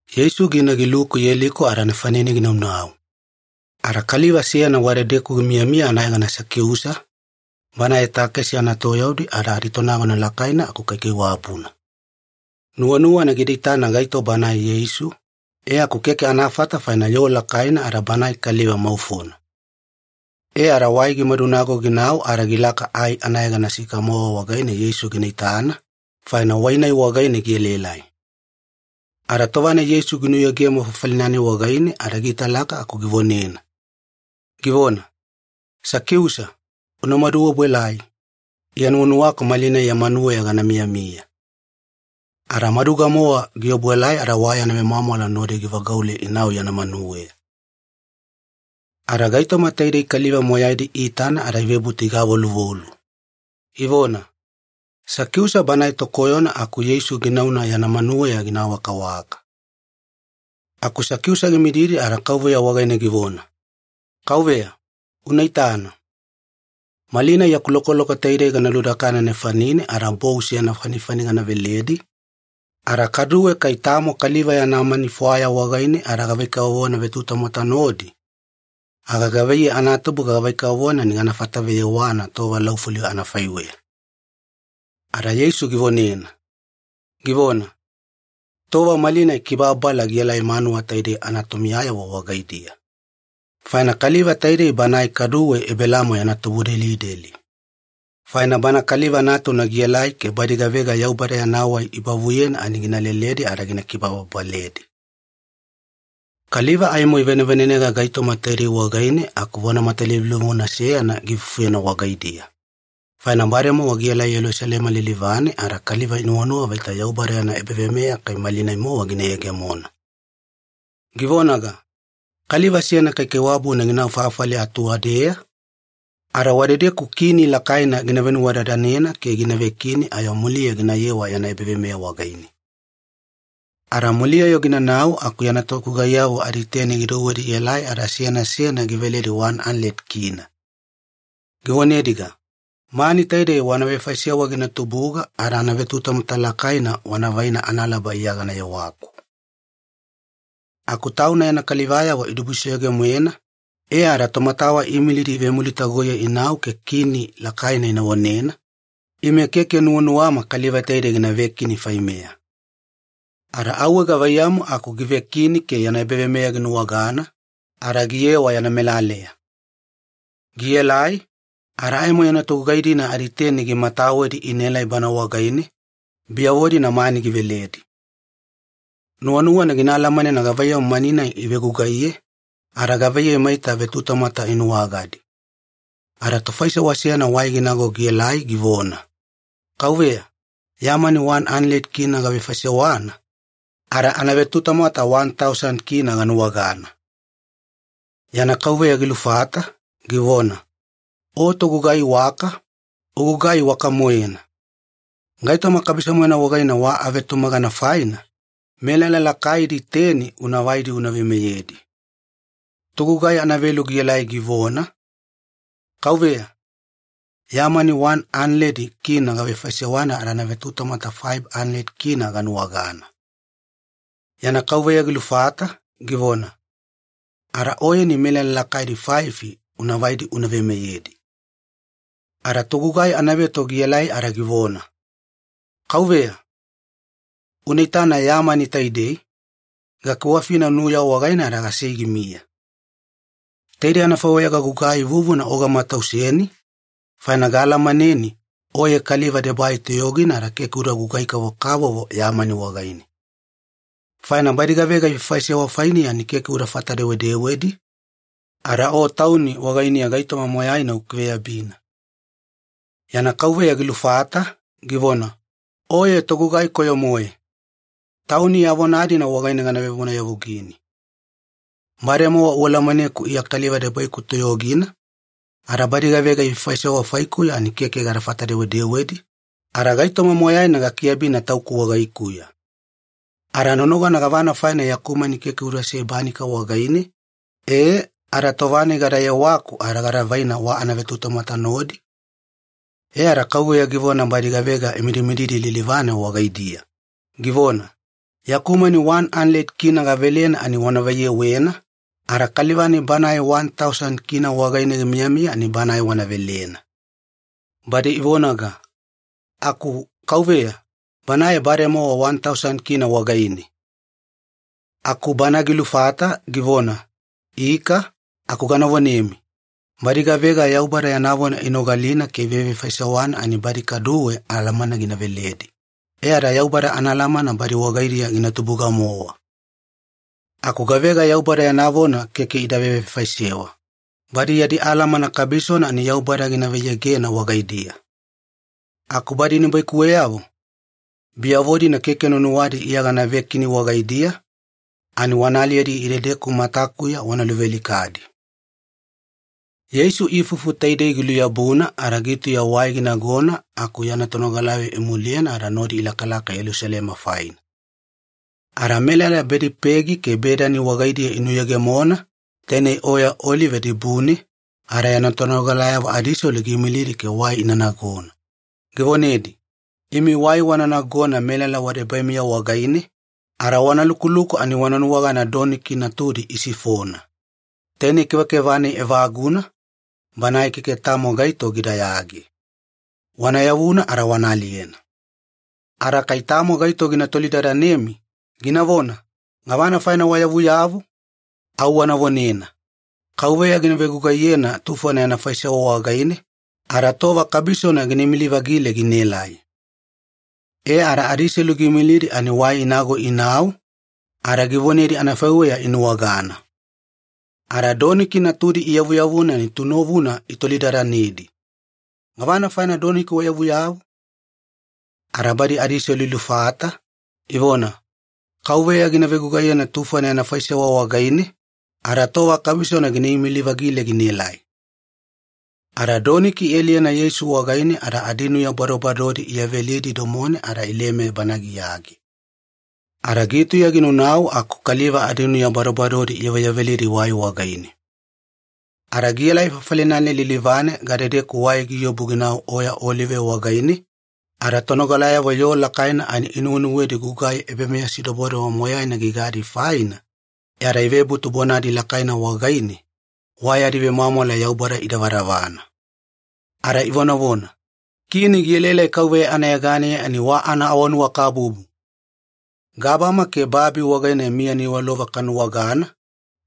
Yeisu gina giluku Yeliko ada nefanine ginaunau. Ada kaliva seyana wadedeku gimiyamiya anayegana Sakiusa, banae takesi anatoyaudi ada aditonagona lakaina aku kaikaiwabuna. Nuwanuwana gida itana gaito banae Yeisu, e aku keke anafata faina yoo lakaina ada banae kaliva maufona. E ada wai gimadunago ginau ada gilaka ai anayegana sikamowa wagaine Yeisu gina itana, faina wai-nai wagaine gielaelai. Ada tova-nai Yeisu ginuyegemo fafali-nai wagaine ada giitalaka aku givonena, givona, “Sakiusa, unamadu obuelai, Iya nuwanuwaku malinai ya manuweya gana miyamiya.” Ada maduga-mowa giobuelai ada wa yana vemwamwala nodi givagaule inau yana manuweya. Ada gaitoma taidei kaliva moyaidi iitana ada ivebutu igavoluvolu, ivona, “Sakiusa banae tokoyona aku Yeisu ginauna yana manuweya gina awakawaka.” Aku Sakiusa gimididi ada Kauveya wagaine givona, “Kauveya, una itana. Malinai yaku lokoloko taidei gana ludakana nefanine ada bou seyana fanifani gana veledi, ada kaduwe kai tamo kaliva yana mani fwaya wagaine ada gavai-kavovona vetutamwata nodi, aga gavaiyei anatubuga gavai-kavovona ani gana fataveyewana tova laufuli anafaiweya.” Ada Yeisu givonena, givona, “Tova malinai kibababala gielai manuwa taidei anatomiyayavo wagaidiya, faina kaliva taidei banae kaduwe Ebelaamo yana tubudelideli. Faina Bana Kaliva Natuna gielai ke badi gavega Yaubada yana wai ibavuyena ani gina leleledi ada gina kibababaledi.” Kaliva aimo ivanevanenega gaitoma taidei wagaine aku vona matalivulivuna seyana giifufuyena wagaidiya, faina bademowa gielai Yelusalema lilivane ada kaliva inuwanuwa vaita Yaubada yana ebaveimeya kai malinai-mowa gina yegemona. Givonaga, “Kaliva seyana kaikaiwabuna ginau fafali atuwadeya, ada wadedeku kini lakaina gina venuwadadanena ke gina vekini ayo muliya ginayewa yana ebaveimeya wagaine. Ada muliya-yo ginanau aku yana togugaiyavo aditeni gidouwedi ielai ada seyana seyana giveledi wani analedi kina (K100). Givonediga, ‘Mani taidei wana vefaisewa gina tubuga ada anavetutamwata lakaina wana vaina analaba Iya gana yewaku.’ “Aku tauna yana kalivayavo idibusoyoge-moena, e ada tomatawa iimilidi ivemulitagoiye inau ke kini lakaina ina vonena, ‘Ime keke nuwanuwama kaliva taidei gina vekini faimeya.’ Ada auwe gavaiyamu aku givekini ke yana ebaveimeya ginuwagana, ada giyewa yana melaleya. Gielai, ada aimo yana togugai-dina aditeni gimatawedi inaelai bana wagaine, biyavo-dina mani giveledi. Nuwanuwana gina alamanena gavaiyamu mani-nai ivegugaiye, ada gavaiyei maita vetutamwata inuwagadi. Ada tofaisewa seyana wai ginago gielai givona, ‘Kauveya, ya mani wani analedi kina (K100) gavefaisewana, ada anavetutamwata wani tausani kina (K1,000) ganuwagana.’ “Yana kauveya gilufata, givona, ‘O togugai iwaka, ugugai iwaka-moena. Gaitoma kabiso-moena wagaine wa avetumagana faina, melala lakaidi teni una vaidi una veimeyedi.’ “Togugai anavelu gielai givona, ‘Kauveya, ya mani wani analedi kina (K100) gavefaisewana ada anavetutamwata faifi analedi kina (K500) ganuwagana.’ “Yana kauveya gilufata, givona, ‘Ada oyeni melala lakaidi faifi una vaidi una veimeyedi.’ “Ada togugai anaveto gielai ada givona, ‘Kauveya, una itana ya mani taidei, gakiwafina nuya wagaine ada gasei gimiya. Taidei anafaiweya gagugai vuvuna o gamatauseni, faina gaalamaneni oye kaliva debai toyogina ada keke uda gugai-kavokavovo ya mani wagaine. Faina badi gavega ifaifaisewa fainiya ani keke udafata-dewedewedi, ada o tauni wagainiya gaitoma moyaina ukiveyabina.’ “Yana kauveya gilufata, givona, ‘Oye togugai koyo-moe! Tauni ya vona-dina wagaine gana vevonayavugini. Bademowa ualamaneku Iya kaliva debaiku toyogina, ada badi gavega ifaifaisewa faikuya ani keke gadafata-dewedewedi, ada gaitoma moyaina gakiabina tauku wagaikuya. Ada nonogana gavana faina yaku mani keke udasei banika wagaine, e ada tova-nai gada yewaku ada gada vaina wa anavetutamwata nodi?’ “E ada kauveya givona badi gavega imidimididi lilivane wagaidiya, givona, ‘Yaku mani wani analedi kina (K100) gavelena ani wana vaiyewena, ada kaliva-nai banae wani tausani kina (K1,000) wagaine gimiyamiya ani banae wana velena.’ “Badi ivonaga, ‘Aku kauveya, banae bademowa wani tausani kina (K1,000) wagaine!’ “Aku bana gilufata, givona, ‘Ika, aku gana vonemi, badi gavega Yaubada yana vona inogalina ke ivevefaisewana ani badi kaduwe alamana gina veledi, e ada Yaubada anaalamana badi wagaidiya gina tubuga-mowa. Aku gavega Yaubada yana vona keke ida vevefaisewa, badi yadi alamana kabisona ani Yaubada gina vaiyegena wagaidiya. Aku badi nibaikuweyavo, biyavo-dina keke nuwanuwadi Iya gana vekini wagaidiya, ani wana aliyedi idedeku matakuya wana luvealikadi.’” Yeisu ifufu taidei giluyabuna ada gitauya wai ginagona aku yana tonogalayavo imuliyena ada nodi ilakalaka Yelusalema faina. Ada melala Bedipegi ke Bedani wagaidiya inuyegemona, tainei oya Olive dibune, ada yana tonogalayavo adiselu giimilidi ke wai ina nagona, givonedi, “Imi wai wana nagona melala wadebaimiya wagaine, ada wana lukuluku ani wana nuwagana doniki natudi isifona. Tainei kevakeva-nai evaguna, banae keke tamo gaito gidayage. Wana yavuna ada wana aliyena. Ada kai tamo gaito gina tolidadanemi, ginavona, ‘Gavana faina wayavuyavu?’ au wana vonena, ‘Kauveya gina vegugaiyena tufona yana faisewa wagaine, ada tova kabisona gina imili-vagile ginaelai.’” E ada adiselu giimilidi ani wai inago inau, ada givonedi anafaiweya inuwagana. Ada doniki natudi iyavuyavuna ani tunovuna itolidadanedi, “Gavana faina doniki wayavuyavu?” Ada badi adiselu ilufata, ivona, “Kauveya gina vegugaiyena tufona yana faisewa wagaine, ada tova kabisona gina imili-vagile ginaelai.” Ada doniki ialiyena Yeisu wagaine ada adinuya badobadodi iyavelidi domone ada ileme Bana giyage. Ada gitauya ginaunau aku kaliva adinuya badobadodi iyaveyavelidi wai wagaine. Ada gielai fafali-nai lilivane gadedeku wai giobu ginau Oya Olive wagaine, ada tonogalayavo yoo lakaina ani inuwenuwedi gugai ebameyasidobodobo moyaina gigadi faina, e ada ivebutu bonadi lakaina wagaine, wa yadi vemwamwala Yaubada idavadavana. Ada ivonavona, “Kini gielaelai KAUVEYA anayeganeya ani wa anaawanuwakabubu! Gabama ke babi wagaine miya niwalova kanuwagana,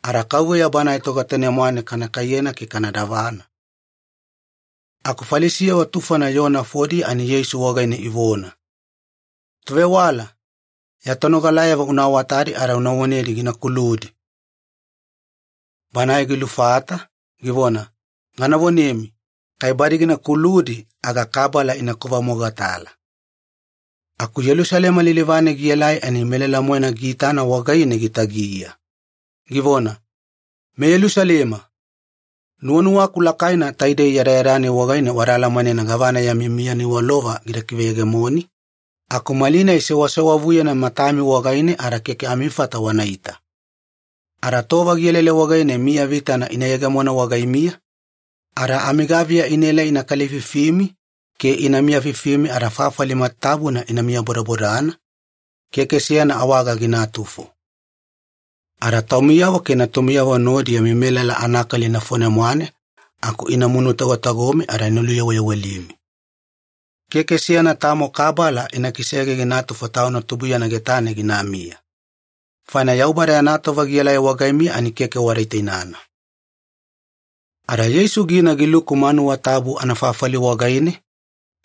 ada KAUVEYA Banae Togetane-mwane kana kaiyena ke kana davana!” Aku Falisiyavo tufona yoo nafodiya ani Yeisu wagaine ivona, “Tovewala, ya tonogalayavo una awatadi ada una vonedi gina kuludi!” Banae gilufata, givona, “Gana vonemi, kai badi gina kuludi aga kabala ina kovamogatala.” Aku Yelusalema lilivane gielai ani melala-moena giitana wagaine gitagiya, givona, “MeYelusalema! Nuwanuwaku lakaina taidei yadayada-nai wagaine wada alamanena gavana yami miya niwalova gida kiveyegemoni, aku malinai sewasewavuyena matami wagaine ada keke amifata wanaita. Ada tova gielaelai wagaine miya vitana ina yegemona wagaimiya, ada amigaviya inaelai ina kalififimi ke ina miyafifimi ada fafali matatabuna ina miyabodabodana, keke seyana awaga ginatufo. Ada taumiyavo ke natumiyavo nodi yami melala anakali nafone-mwane aku ina munutagotagomi ada ina luyaweyawelimi. Keke seyana tamo kabala ina kisege ginatufo tauna tubuiyana getane ginamiya. Faina Yaubada yana tova gielai wagaimiya ani keke wada itainana.” Ada Yeisu gina giluku manuwa tabu anafafali wagaine,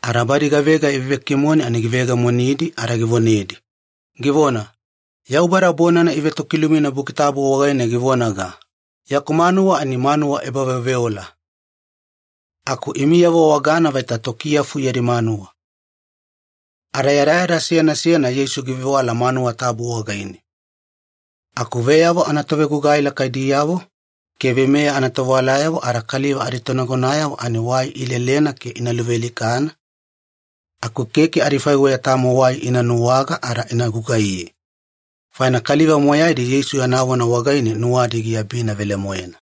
ada badi gavega ivevekimone ani giveyegemonidi ada givonedi, givona, “Yaubada bonana ivetokilumina Buki Tabu wagaine givonaga, ‘Yaku manuwa ani manuwa ebaveoveola’. Aku imiyavo wagana vaita tokiyafu yadi manuwa.” Ada yadayada seyana seyana Yeisu givevewala manuwa tabu wagaine. Aku veyavo anatovegugai lakaidiyavo ke veimeya anatovewalayavo ada kaliva aditonagonayavo ani wai ilelena ke ina luvealikana, aku keke adifaiweya tamo wai ina nuwaga ada ina gugaiye, faina kaliva moyaidi Yeisu yana vona wagaine nuwadi giabina velemoena.